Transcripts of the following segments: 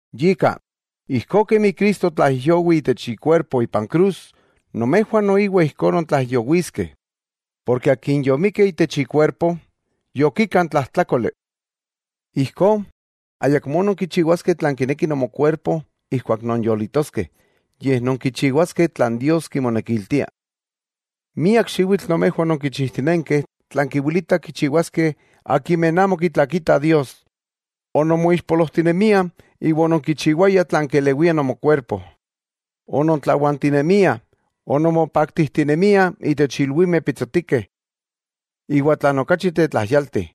Yika, ijkó kemi Cristo otlaijyowi itech ikuerpo ipan krus, nomejwah noiwa ijkó nontlaijyowiskeh. Porke akin yomikki itech ikuerpo, yokika n tlajtlákoli. Ijkó, ayakmó nonkichiwaskeh tlan kineki nomokuerpo ijkuak nonyolitoskeh, yej nonkichiwaskeh tlan Dios kimonekiltia. Miak xiwitl nomejwah ononkichijtinenkeh tlan kiwilitah kichiwaskeh akimeh amo kitlakitah Dios. Ononmoixpolojtinemiah iwa ononkichiwayah tlan kelewiah nomokuerpo, onontlawantinemiah, ononmopaktijtinemiah itech ilwimeh pitsotikeh. Iwa tlan okachi tetlajyalti,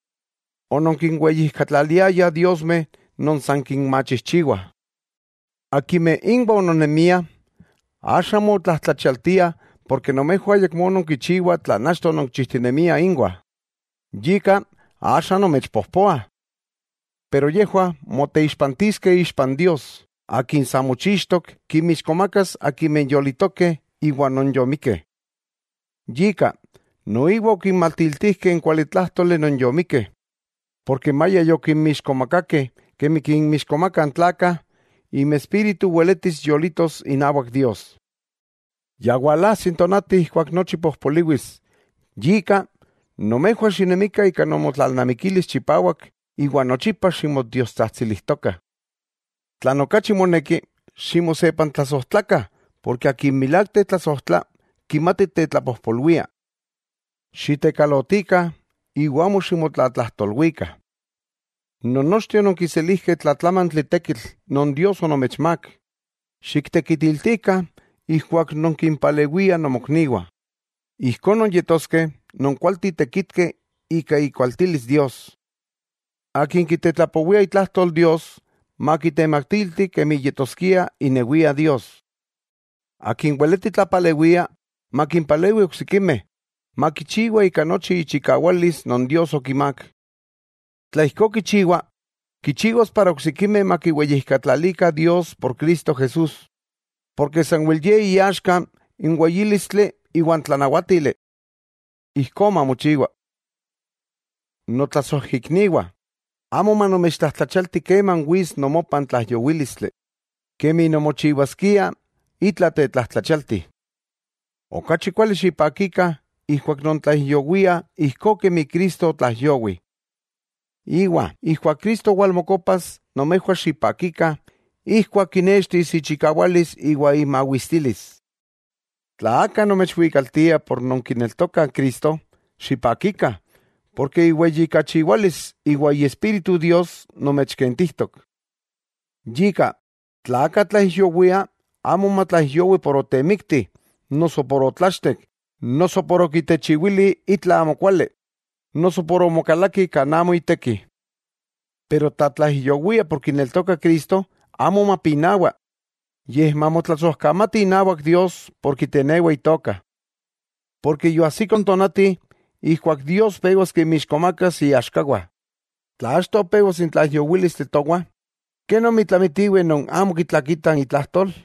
ononkinweyijkatlaliayah diosmeh non san kinmachijchiwah. Akimeh inwah ononnemiah, axa motlajtlachialtiah porke nomejwah ayakmó nonkichiwah tlan achto ononkichijtinemiah inwah, yika axa nomechpojpoah. Pero yejwah moteixpantiskeh ixpa n Dios, Akin sa mochixtok kinmixkomakas akimeh yolitokeh iwa non yomikkeh. Yika, noiwa okinmatiltijkeh n kualitlájtoli non yomikkeh, porke maya yokinmixkomakakeh kemi kinmixkomakah n tlakah, inmespíritu weletis yolitos inawak Dios. Ya walajsi n tonati ijkuak nochi pojpoliwis. Yika, nomejwah xinemikah ika nomotlalnamikilis chipawak iwa nochipa ximotiotsajtsilijtokah. Tlan okachi moneki, ximosepantlasojtlakah, porke akin milák tetlasojtla, kimati tetlapojpolwia. Xitekalotikah iwa amo ximotlatlajtolwikah. Nonnochteh ononkiselijkeh tlatlamantli tekitl non Dios onomechmák, xiktekitiltikah ijkuak nonkimpalewiah nomokniwah, ijkó nonyetoskeh non kualteh tekitkeh ika ikualtilis Dios. Akin kitetlapowia itlajtol Dios, makitematilti kemi yetoskia inewia Dios. Akin weleti tlapalewia makimpalewi oksikimeh, makichiwa ika nochi ichikawalis non Dios okimák. Tla ijkó kichiwa, kichiwas para oksikimeh makiweyijkatlalikah Dios por Cristo Jesús, porke sanwel Ye iaxka n weyílistli iwan tlanawátili. Ijkó mamochiwa. Notlasojikniwah, amo manomechtlajtlachialti keman wits nomopah n tlaijyowílistli, kemi nonmochiwaskiah itla tetlajtlachialti. Okachi kuali xipakikah ijkuak nontlaijyowiah ijkó kemi Cristo otlaijyowi, iwa ijkuak Cristo walmokopas nomejwah xipakikah ijkuak kinextis ichikawalis iwa imawistilis. Tla aka nomechwikaltiah por nonkineltokah Cristo, xipakikah, porke iweyijkachiwalis iwa Iespíritu Dios nomechkentijtok. Yika, tla aka tlaijyowia, amo matlaijyowi por otemikti, noso por otlachtek, noso por okitechiwili itla amokuali, noso por omokalaki kan amo iteki. Pero tla tlaijyowia por kineltokah Cristo, amo mapinawa, yej mamotlasojkamati inawak Dios por kitenewa Itoka. Porke yoajsiko n tonati ijkuak Dios pewas kinmixkomakas iaxkawah. Tla achto pewas n tlaijyowílistli towah, ¿kenomi tlamitiweh non amo kitlakitah itlajtol?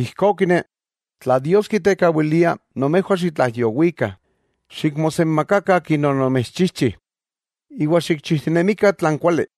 Ijkó kine, tla Dios kitekawilia nomejwah xitlaijyowikah, xikmosenmakakah Akin onomechchijchi, iwa xikchijtinemikah tlan kuali.